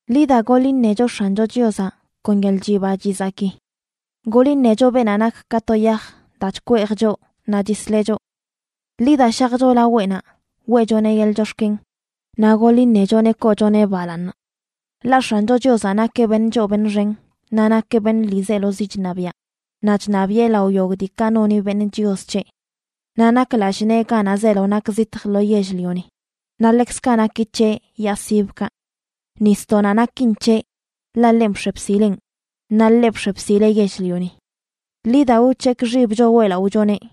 Ḻi da, goḻ iṉecho X̱ancho Chiozaꞌ kon yeḻꞌ chiba chizaki. Goḻ iṉecho beenaꞌ nak ka to yaj daa chkweej choꞌ naꞌ chisleꞌ choꞌ. Ḻi da, shajcho laweꞌnaꞌ weꞌchoneꞌ yeḻꞌ chox̱ken, naꞌ goḻ iṉechoneꞌ koochoneꞌ balaaṉ. Ḻaꞌ X̱ancho Chiozaꞌ nakeꞌ beṉꞌ choo beṉꞌ xen, naꞌ nakeꞌ beṉꞌ ḻiizelozi chṉabiaꞌ, naꞌ chṉabiꞌe lao yogꞌ diikaꞌ noni beṉꞌ chios c̱heꞌ. Naꞌ nak lallꞌ nee ganaꞌ zeelo nak zitj lo yell-lioni, naꞌ ḻekzkaꞌ naki c̱heꞌ yaa sibkaꞌ. Nisdoꞌnaꞌ nakin c̱heꞌ, ḻaꞌ ḻenꞌ bx̱e bsileꞌn, naꞌ ḻeꞌ bx̱e bsileꞌ yell-lioni. Ḻi da, wc̱hekꞌ xibcho weꞌlaꞌochoneꞌ.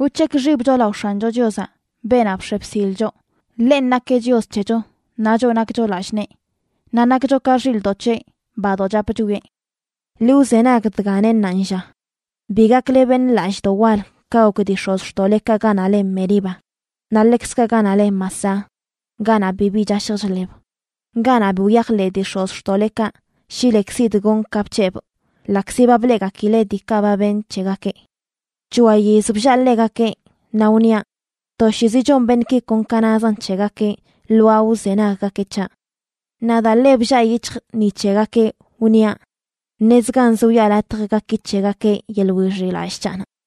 Wc̱hekꞌ xibcho lao X̱ancho Chiozaꞌ, beenaꞌ bx̱e bsil choꞌ. Ḻenꞌ nakeꞌ Chios c̱hecho, naꞌ choꞌ nakcho lallꞌ nee, naꞌ nakcho ka xilꞌdoꞌ c̱heꞌ badoꞌ chap chwieꞌ. Ḻi wzenag dga neꞌ ṉaanlla: “Bi gakle beṉꞌ lallꞌdoꞌ wal ka gok dii x̱ozxtoꞌlekaꞌ ganaꞌ le Meriba, naꞌ ḻekzkaꞌ ganaꞌ le Masah, ganaꞌ bibi chashj chḻeb, ganaꞌ bi wyajḻeꞌ dii x̱ozxtoꞌlekaꞌ shi lekzidꞌ gonꞌ ka bc̱hebꞌ, ḻaꞌkzi ba bleꞌgakileꞌ diikaꞌ ba benꞌ c̱hegakeꞌ. C̱hoa yiz bllaa ḻegakeꞌ, naꞌ wniaꞌ: Toshiizi chon beṉꞌki kon ka nazan c̱hegakeꞌ lwaa wzenaggakeꞌ c̱haꞌ. Naꞌ daa ḻe bllaa yic̱hjꞌ ni c̱hegakeꞌ, wniaꞌ: Ṉezganz wiꞌa latj gaki c̱hegakeꞌ yeḻꞌ wixiꞌlallꞌ c̱haꞌnaꞌ.”